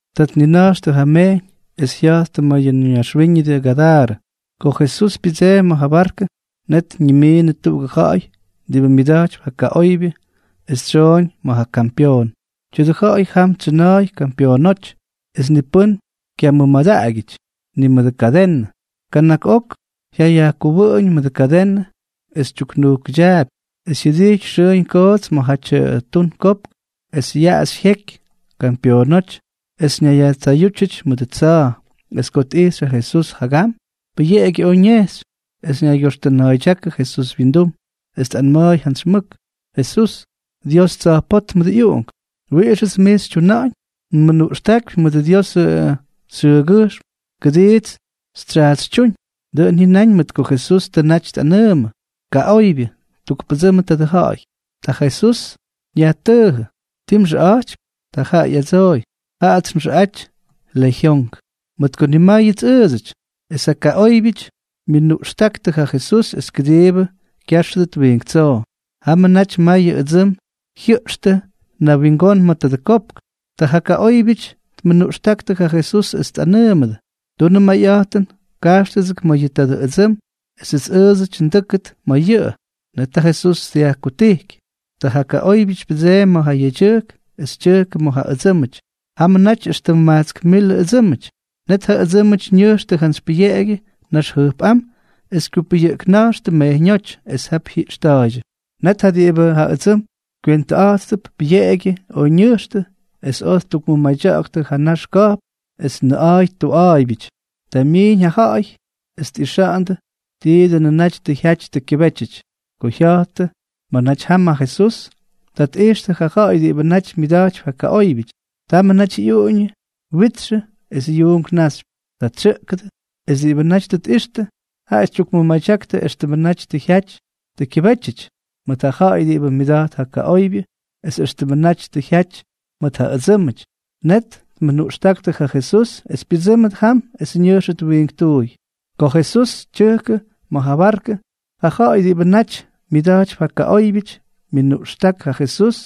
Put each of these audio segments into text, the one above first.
Ta tnina̱jxtʉ ja mejyñ, es jya̱jttʉ ma̱ yʉ ñaxwíñʉdʉ Gadarʉ. Ko ja Jesús pyʉdseemy ma̱ ja barkʉ, net ñimiinʉ tuꞌugʉ ja̱ꞌa̱y diꞌibʉ myʉda̱jtypy ja kaꞌoybyʉ es tsyooñ ma̱ ja kampyoon. Tya̱dʉ ja̱ꞌa̱y jam tsyʉna̱a̱y kampyoonóty es ni pʉ́n kyamʉmadaꞌagyʉty, ni mʉdʉ kadenʉ. Kana̱k ok jyayajkʉwʉꞌʉñ mʉdʉ kadenʉ, es tyuknujkʉdyaapy, es jyʉdity xʉʉñ koots ma̱jatyʉ tun kopk, es yaꞌaxy jyeky kampyoonóty es ñayyajtsayútyʉty mʉdʉ tsa̱a̱. Es ko tꞌijxy ja Jesús jagam, pʉyeꞌegyʉ oj ñejxy, es ñaygyoxtʉna̱a̱ydyákʉ Jesús wyindum, es tꞌanma̱a̱y jantsy mʉk: —Jesús, Dios Tsa̱jpótmʉdʉ ꞌyUꞌunk, ¿wiꞌixʉts mij xytyuna̱ꞌa̱ñ? ¡Nmʉnuꞌxtákypy mʉdʉ Diosʉ xyʉʉgyʉjxm kʉdiits xytsyaatsytyúñ! Dʉꞌʉn jyʉnáñ mʉt ko Jesús tʉ naty tꞌanʉʉmʉ: —Kaꞌoybyʉ, tukpʉdsʉmʉ tadʉ ja̱ꞌa̱y. Ta ja Jesús yajtʉʉjʉ: —¿Ti mxʉꞌa̱jtypy? Ta jaꞌa ꞌyadsooy: —Jaꞌats nxʉꞌaty Lejyonk, mʉt ko nimáyʉts ʉʉdsʉty. Es ja kaꞌóybyʉty myʉnuꞌxtáktʉ ja Jesús es kʉdiibʉ kyáxʉdʉt wiink tsoo. Jamʉ naty mayʉ ʉdsʉm jyʉꞌxtʉ nawingón ma̱ tadʉ kopk. Ta ja kaꞌóybyʉty tmʉnuꞌxtáktʉ ja Jesús es tꞌanʉʉmʉdʉ: —Tunʉ mayꞌa̱jtʉn, kajxtʉgʉts ma̱ yʉ tadʉ ʉdsʉm esʉts ʉʉdsʉty ndʉ́kʉdʉt ma̱ yʉꞌʉ. Net ja Jesús dyajkutijky. Ta ja kaꞌóybyʉty pyʉdseemy ma̱ ja yedyʉjk es tyʉjkʉ ma̱ ja ʉdsʉ́mʉty. Jamʉ naty éxtʉm majtsk milʉ ʉdsʉ́mʉty. Net ja ʉdsʉ́mʉty ñʉjxtʉ jantsy pʉyeꞌegyʉ nax jʉjpꞌám es kyupʉyʉꞌkna̱jxtʉ mejyñóty, es jap jyiꞌxta̱a̱ydyʉ. Net ja diꞌibʉ ja ʉdsʉm kywentʉꞌa̱jttʉp pʉyeꞌegyʉ oj ñʉjxtʉ, es oj ttukmʉmadya̱ꞌa̱ktʉ ja nax ka̱jpn es nʉꞌa̱a̱y tuꞌa̱a̱ybyʉty. Ta myiiñ ja ja̱ꞌa̱y es tꞌixandʉ ti dʉnʉ naty tʉ jyaty tʉ kyʉbétyʉty. Ko jya̱jttʉ ma̱ naty jam ja Jesús, ta tꞌijxtʉ ja ja̱ꞌa̱y diꞌibʉ naty myʉda̱jtypy ja kaꞌóybyʉty. Tamʉ naty ꞌyuꞌuñʉ witxʉ es yuunk naxypy. Ta ttsʉꞌkʉdʉ, es diꞌibʉ naty tʉ tꞌixtʉ, jaꞌa tyukmʉmadyaktʉ éxtʉmʉ naty tʉ jyaty tʉ kyʉbety mʉt ja ja̱ꞌa̱y diꞌibʉ myʉda̱jt ja kaꞌóybyʉty es éxtʉmʉ naty tʉ jyaty mʉt ja ʉdsʉ́mʉty. Net tmʉnuꞌxtáktʉ ja Jesús es pyʉdsʉ́mʉt jam es ñʉjxʉt wiinktuuy. Ko ja Jesús tyʉjkʉ ma̱ ja barkʉ, ja ja̱ꞌa̱y diꞌibʉ naty myʉda̱jtypy ja kaꞌóybyʉty myʉnuꞌxták ja Jesús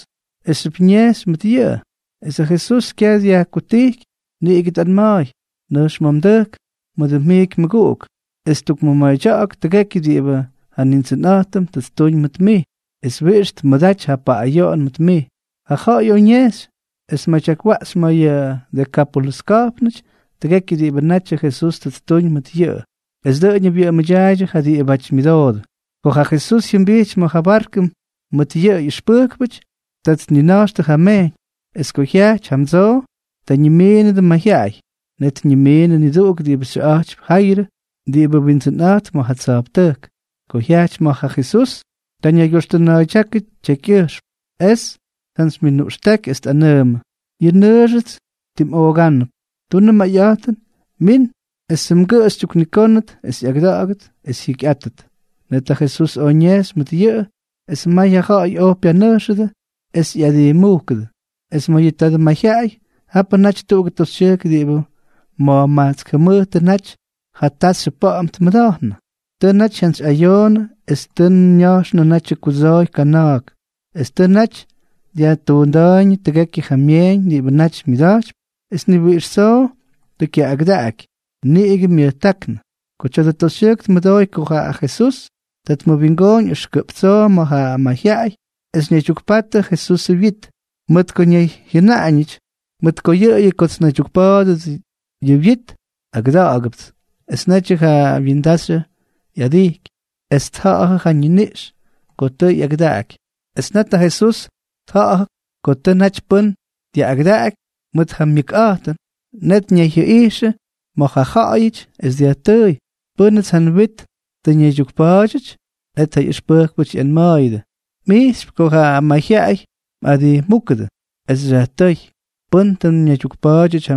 esxyʉp ñejxy mʉt yʉꞌʉ. Es ja Jesús kyaj dyajkutijky, niꞌigʉ tꞌanma̱a̱y: —Nʉjx ma̱ mdʉjk mʉdʉ mjiiky mmʉguꞌuk, es tukmʉmadya̱ꞌa̱k tʉgekyʉ diꞌibʉ ja Nindsʉnꞌa̱jtʉm tʉ ttuñ mʉt mij, es wiꞌix tʉ tmʉdaty ja paꞌꞌayoꞌon mʉt mij. Ja ja̱ꞌa̱y oj ñejxy, es tmadyakwaꞌxy ma̱ yʉ Dekápolʉs ka̱jpnʉty tʉgekyʉ diꞌibʉ natyʉ Jesús tʉ ttuñ mʉt yʉꞌʉ. Es dʉꞌʉñʉ wyʉꞌʉmʉdyaaydyʉ ja diꞌibáty myʉdoodʉ. Ko ja Jesús jyʉmbijty ma̱ ja barkʉ mʉt ja ꞌyʉxpʉjkpʉty, ta tnina̱jxtʉ ja mejyñ. Es ko jyajty jamdsoo, ta ñimiinʉdʉ mayjyaꞌay. Net ñimiinʉ niduꞌuk diꞌibʉ xyʉꞌa̱jtypy Jayrʉ, diꞌibʉ windsʉnꞌa̱jtp ma̱ ja tsa̱jptʉjk. Ko jyajty ma̱ ja Jesús, ta ñaygyoxtʉna̱a̱ydyákʉ tyekyꞌʉjxm, es tjantsymyʉnuꞌxtáky, es tꞌanʉʉmʉ: —Yʉ nnʉʉxʉts timꞌoogánʉp. Tunʉ mayꞌa̱jtʉn, min esʉ mgʉꞌʉ xytyuknikónʉt es ꞌyagʉda̱ꞌa̱gʉt es jyikyꞌátʉt. Net ja Jesús oj ñejxy mʉt yʉꞌʉ, es may ja ja̱ꞌa̱y oj pyanʉjxʉdʉ es ꞌyadijmúkʉdʉ. Es ma̱ yʉ tadʉ mayjyaꞌay, japʉ naty tuꞌugʉ toxytyʉjk diꞌibʉ ma̱jmajtsk jʉmʉjtʉ naty ja taxyʉ pa̱ꞌa̱m tmʉda̱jnʉ. Tʉ naty jyantsyꞌayoonʉ es tʉ ña̱jxnʉ natyʉ kudsooy kana̱a̱k, es tʉ naty dyajtuunda̱a̱yñʉ tʉgekyʉ ja myeeñ diꞌibʉ naty myʉda̱jtypy, es ni wiꞌix tsoo tʉ kyaꞌꞌagʉdaꞌaky, niꞌigʉ myʉjtáknʉ. Ko tya̱dʉ toxytyʉjk tmʉdooy ko jaa ja Jesús, ta tmʉwingooñ ʉxkʉꞌp tsoo ma̱ ja mayjyaꞌay, es ñaydyukpatʉ ja Jesusʉ wyit, mʉt ko ñayjyʉnaꞌañʉty: “Mʉt yʉꞌʉyʉ kots nnaydyukpa̱a̱dʉdʉ yʉ wyit, agʉda̱ꞌa̱gʉpts.” Es netyʉ ja wyindaxyʉ ꞌyadijky, es tja̱ꞌa̱jʉ ja ñiniꞌx ko tʉ ꞌyagʉdaꞌaky. Es net ja Jesús tja̱ꞌa̱jʉ ko tʉ naty pʉ́n dyaꞌꞌagʉdaꞌaky mʉt ja myʉkꞌa̱jtʉn. Net ñayjyʉꞌijxʉ ma̱ ja ja̱ꞌa̱yʉty, es dyajtʉʉy: —¿Pʉ́nʉts ja nwit tʉ ñaydyukpa̱a̱dyʉty? Net ja ꞌyʉxpʉjkpʉty ꞌyanma̱a̱yʉdʉ: —Mꞌijxypy ko ja mayjyaꞌay mꞌadijmúkʉdʉ, es xyajtʉ́y: “¿Pʉ́n tʉ ñaydyukpa̱a̱dyʉty ja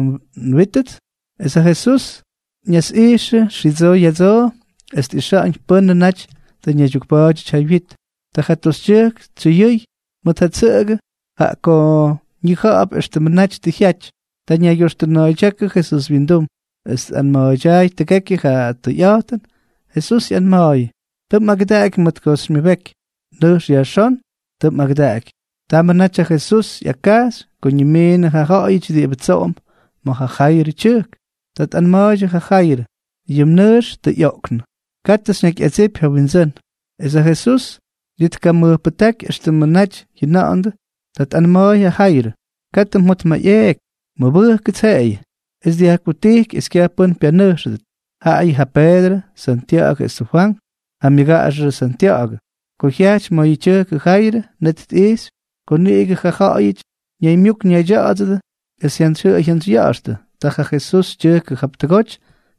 nwítʉts?” Es ja Jesús ñasꞌijxʉ xidsoo ya̱dsoo es tꞌixa̱ꞌa̱ñ pʉ́nʉ naty tʉ ñaydyukpa̱a̱dyʉty ja wyit. Ta ja toxytyʉjk tsyʉyʉy mʉt ja tsʉꞌʉgʉ, jaꞌa ko ñija̱ꞌa̱p éxtʉmʉ naty tʉ jyaty. Ta ñaygyoxtʉna̱a̱ydyákʉ Jesús wyindum, es tꞌanma̱a̱ydyaay tʉgekyʉ ja tʉyꞌa̱jtʉn. Jesús ꞌyanma̱a̱yʉ: —Tʉ mꞌagʉdaꞌaky mʉt ko tʉ xymyʉbeky. Nʉjx yajxón. Tʉ mꞌagʉdaꞌaky. Támnʉmʉ naty ja Jesús ꞌyakkajxy ko ñimiinʉdʉ ja ja̱ꞌa̱yʉty diꞌibʉ tsoꞌomp ma̱ ja Jayrʉ tyʉjk. Ta tꞌanma̱a̱ydyʉ ja Jayrʉ: —Yʉ mnʉʉx tʉ ꞌyoꞌknʉ. Katʉ xyñakyꞌadsipy ja Windsʉ́n. Es ja Jesús ni tkamʉjpʉjtáky éxtʉmʉ naty jyʉna̱ꞌa̱ndʉ. Ta tꞌanma̱a̱y ja Jayrʉ: —Katʉ mjotmayꞌeeky. Mʉbʉjkʉts jeꞌeyʉ. Es tkutijky es kyaj pʉ́n pyanʉjxʉdʉt, jaꞌayʉ ja Peedrʉ, Santya̱ꞌa̱gʉ esʉ Fwank, ja myʉgaꞌaxʉ Santya̱ꞌa̱gʉ. Ko jyajty ma̱ ja tyʉjkʉ Jayrʉ, net tꞌijxy ko niꞌigʉ ja ja̱ꞌa̱yʉty ñaymyuk ñaydya̱ꞌa̱dsʉdʉ es jyantsyjyʉꞌʉy jyantsyya̱ꞌa̱xtʉ. Ta ja Jesús tyʉjkʉ jap tʉgoty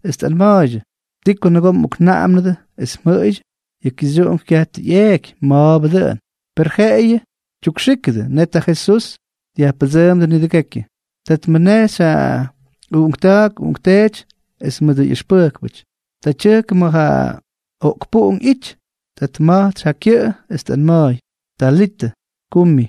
es tꞌanma̱a̱ydyʉ: —¿Ti ko nʉgoo mꞌoknaꞌamnʉdʉ es mjʉꞌʉydyʉ? Yʉ kixyuꞌunk kyaj tʉ ꞌyeeky, ma̱a̱bʉ dʉꞌʉn. Per jeꞌeyʉ tyukxíkʉdʉ. Net ja Jesús dyajpʉdsʉʉmdʉ nidʉgekyʉ. Ta tmʉnejxy ja uꞌunkta̱a̱k uꞌunkteety es mʉdʉ ꞌyʉxpʉjkpʉty. Ta tyʉjkʉ ma̱ ja oꞌkpuꞌunk ꞌyity. Ta tma̱jtsʉ ja kyʉꞌʉ es tꞌanma̱a̱y: —Talita, kumi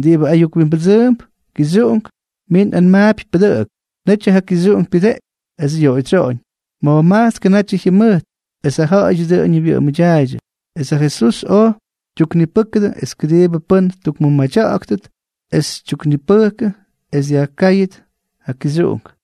(diꞌibʉ ayuk wimbʉdsʉʉmp: “Kixyuꞌunk, mij nꞌanmaapy, pʉdʉꞌʉk.”) Netyʉ ja kixyuꞌunk pyʉdeꞌky es yoꞌoydsyoꞌoñ. Ma̱jmajtskʉ natyʉ jyʉmʉjt. Es ja ja̱ꞌa̱yʉty dʉꞌʉñʉ wyʉꞌʉmʉdyaaydyʉ. Es ja Jesús oj tyuknipʉ́kʉdʉ es kʉdiibʉ pʉ́n ttukmʉmadya̱ꞌa̱ktʉt, es tyuknipʉjktʉ es dyajkáyʉt ja kixyuꞌunk.